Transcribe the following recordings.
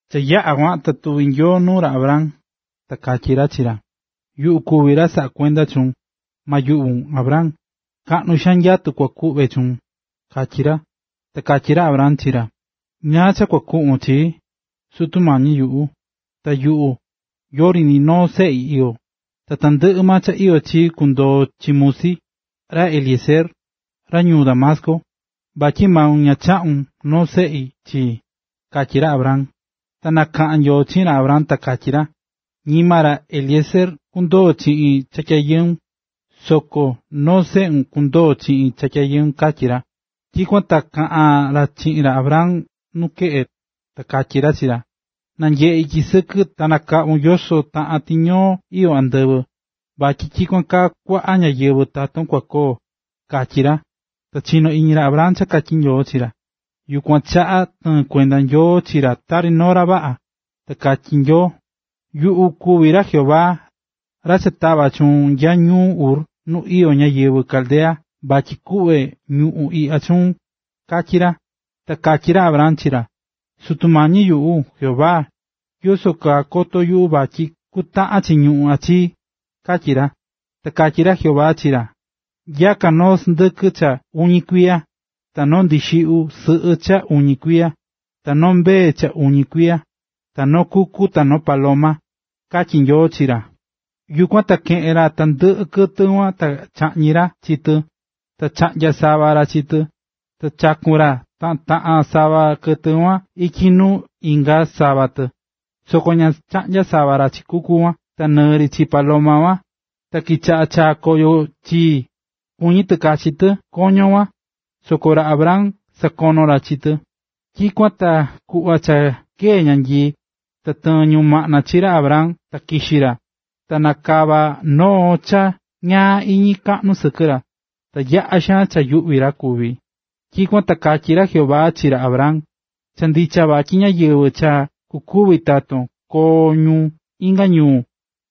Cha yaꞌa kuan ta tuvi̱ Nyoo nuu ra Abram, ta katyí ra chi ra: ―Yuꞌu kuví ra saꞌá kuenda chuun, ma yuꞌvun, Abram, kaꞌnu xaan nyatu kua kuꞌve chuun ―katyí ra. Ta katyí ra Abram chi ra: ―¿Ñáá cha kua kuꞌvon chi yuꞌu, Sutu Mañi yuꞌu, ta yuꞌu, yori ni noo seꞌi iyó? Ta tandɨꞌɨ maa cha iyó chii kundoo chi musi, ra Eliezer, ra ñuu Damasco, vatyi maun ña chaꞌu̱n noo seꞌe chi ndi ―katyí ra Abram. Ta nakaꞌa̱n Nyoo chiꞌin ra, ta katyí ra: ―Ñima ra Eliezer kundoo chiꞌin cha tyayɨun, soko noo seꞌun kundoo chiꞌin cha tyayɨun ―katyí ra. Tyikuan ta kuaꞌan ra chiꞌin ra Abram nu keꞌe, ta katyí ra chi ra: ―Na̱nyeꞌe ityi sɨkɨ ta nakaꞌvun yoso taꞌan tiñoo iyó andɨvɨ, vatyi tyikuan kaa cha kuaꞌa ñáyɨvɨ taton kua koo ―katyí ra. Ta chino̱ iñi ra Abram cha katyí Nyoo chi ra, yukuan chaꞌa tɨɨ̱n kuenda Nyoo chi ra tari noo ra vaꞌa.a Ta katyí Nyoo: ―Yuꞌu kuví ra Jehová, ra cha tava̱ chuun nya ñuu Ur nu iyó ñáyɨvɨ Caldea vatyi kuꞌve ñuꞌún iꞌya chuun ―katyí ra. Ta katyí ra Abram chi ra: ―Sutu Mañi yuꞌu, Jehová, ¿yoso kaa koto yuꞌu vatyi kutaꞌan chi ñuꞌún iꞌya chii? ―katyí ra. Ta katyi ra Jehová chi ra: ―Nya̱ka noo sɨndɨkɨ cha uñi kuiya, ta noo ndixiꞌyu sɨꞌɨ cha uñi kuiya, ta noo mbee cha uñi kuiya, ta noo kuku ta noo paloma ―katyí Nyoo chi ra. Yukuan ta keꞌe̱n ra tandɨꞌɨ kɨtɨ kuan ta chaꞌñi̱ ra chi tɨ, ta chaꞌnya̱ sava ra chi tɨ. Ta chaku̱n ra taꞌan taꞌan sava kɨtɨ kuan ityi nuu inga sava tɨ, soko ña chaꞌnya̱ sava ra chi kuku kuan ta nɨɨ ri chi paloma. Ta kichaꞌa̱ chaá koyo chii, kuñí tɨ kachi tɨ koño kuan, soko ra Abram sakono̱ ra chi tɨ. Tyikuan ta kuꞌva cha kee̱ ñanyii, ta tɨɨ̱n ñumaꞌna chi ra Abram ta kixi̱ ra. Ta nakava̱ noo cha ñaa iñi kaꞌnu sɨkɨ ra, ta yaꞌa̱ xaan cha yuꞌví ra kuvi̱. Tyikuan ta katyí ra Jehová chi ra Abram: ―Cha ndicha vatyi ñáyɨvɨ cha kukuvi taton koo ñu inga ñuu,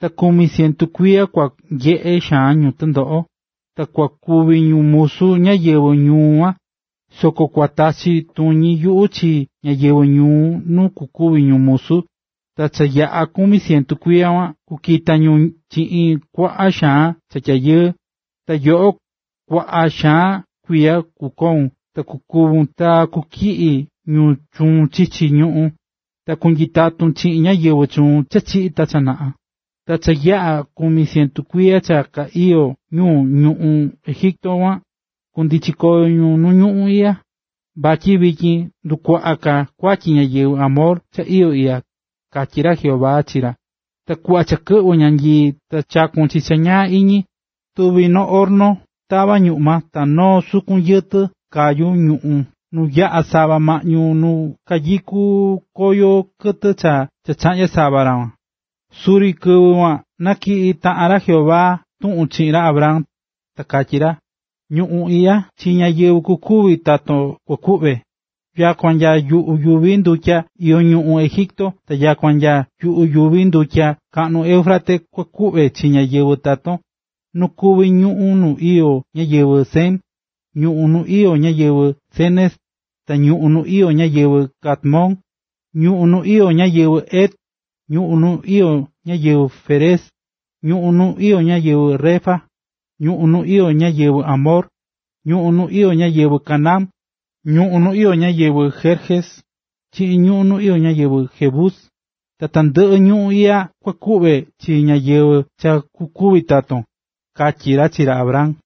ta kumi cientu kuiya kua nyeꞌe xaan ñu tɨndoꞌo, ta kua kuvi ñu musu ñáyɨvɨ ñuu kuan. Soko kua tachi tuñi yuꞌu chi ñáyɨvɨ ñuu nu kukuvi ñu musu, ta cha yaꞌa kumi cientu kuiya kuan kukita ñu chiꞌin kuaꞌa xaan cha tyayɨɨ. Ta yoꞌo, kuaꞌa xaan kuiya kukoun ta kukúvun ta kutyiꞌi ñu chuun chichi ñuꞌún, ta kunyitatun chiꞌin ñáyɨvɨ chuun cha chiꞌi̱ ta cha naꞌa. Ta cha yaꞌa̱ kumi cientu kuiya cha ka iyó ñu ñuꞌún Egipto kuan, kundichi koyo ñu nu ñuꞌún iꞌya, vatyi vityin ta ndukuaꞌa ka kuatyi ñáyɨvɨ Amor cha iyó iꞌya ―katyí ra Jehová chi ra. Ta kuꞌva cha kɨꞌvɨ̱ ñanyii ta chakun chi cha ñaa iñi, tuvi̱ noo horno tavá ñuꞌma ta noo sukun yɨtɨ kɨvɨ kayú ñuꞌu̱n nuu yaꞌa̱ sava maꞌñu nu kayukú koño kɨtɨ cha chaꞌnya̱ sava ra kuan. Suri kɨvɨ kuan natyiꞌi̱ taꞌan ra Jehová tuꞌun chiꞌin ra Abram, ta katyí ra: ―Ñuꞌún iꞌya chi ñáyɨvɨ kukuvi taton kukuꞌve, nyakua nya yuꞌu yuvi ndutya iyó ñuꞌún Egipto ta nyakua nya yuꞌu yuvi ndutya kaꞌnu Éufrates kua kuvi chi ñáyɨvɨ taton: nu kuví ñuꞌún nu iyó ñáyɨvɨ Cen, ñuꞌún nu iyó ñáyɨvɨ Cenez, ta ñuꞌún nu iyó ñáyɨvɨ Cadmón, ñuꞌún nu iyó ñáyɨvɨ Het, ñuꞌún nu iyó ñáyɨvɨ Férez, ñuꞌún nu iyó ñáyɨvɨ Refa, ñuꞌún nu iyó ñáyɨvɨ Amor, ñuꞌún nu iyó ñáyɨvɨ Canaán, ñuꞌún nu iyó ñáyɨvɨ Gerges, chiꞌin ñuꞌún nu iyó ñáyɨvɨ Jebus. Tandɨꞌɨ ñuꞌún iꞌya kua kuꞌve chi ñáyɨvɨ cha kukuvi taton ―katyí ra chi ra Abram.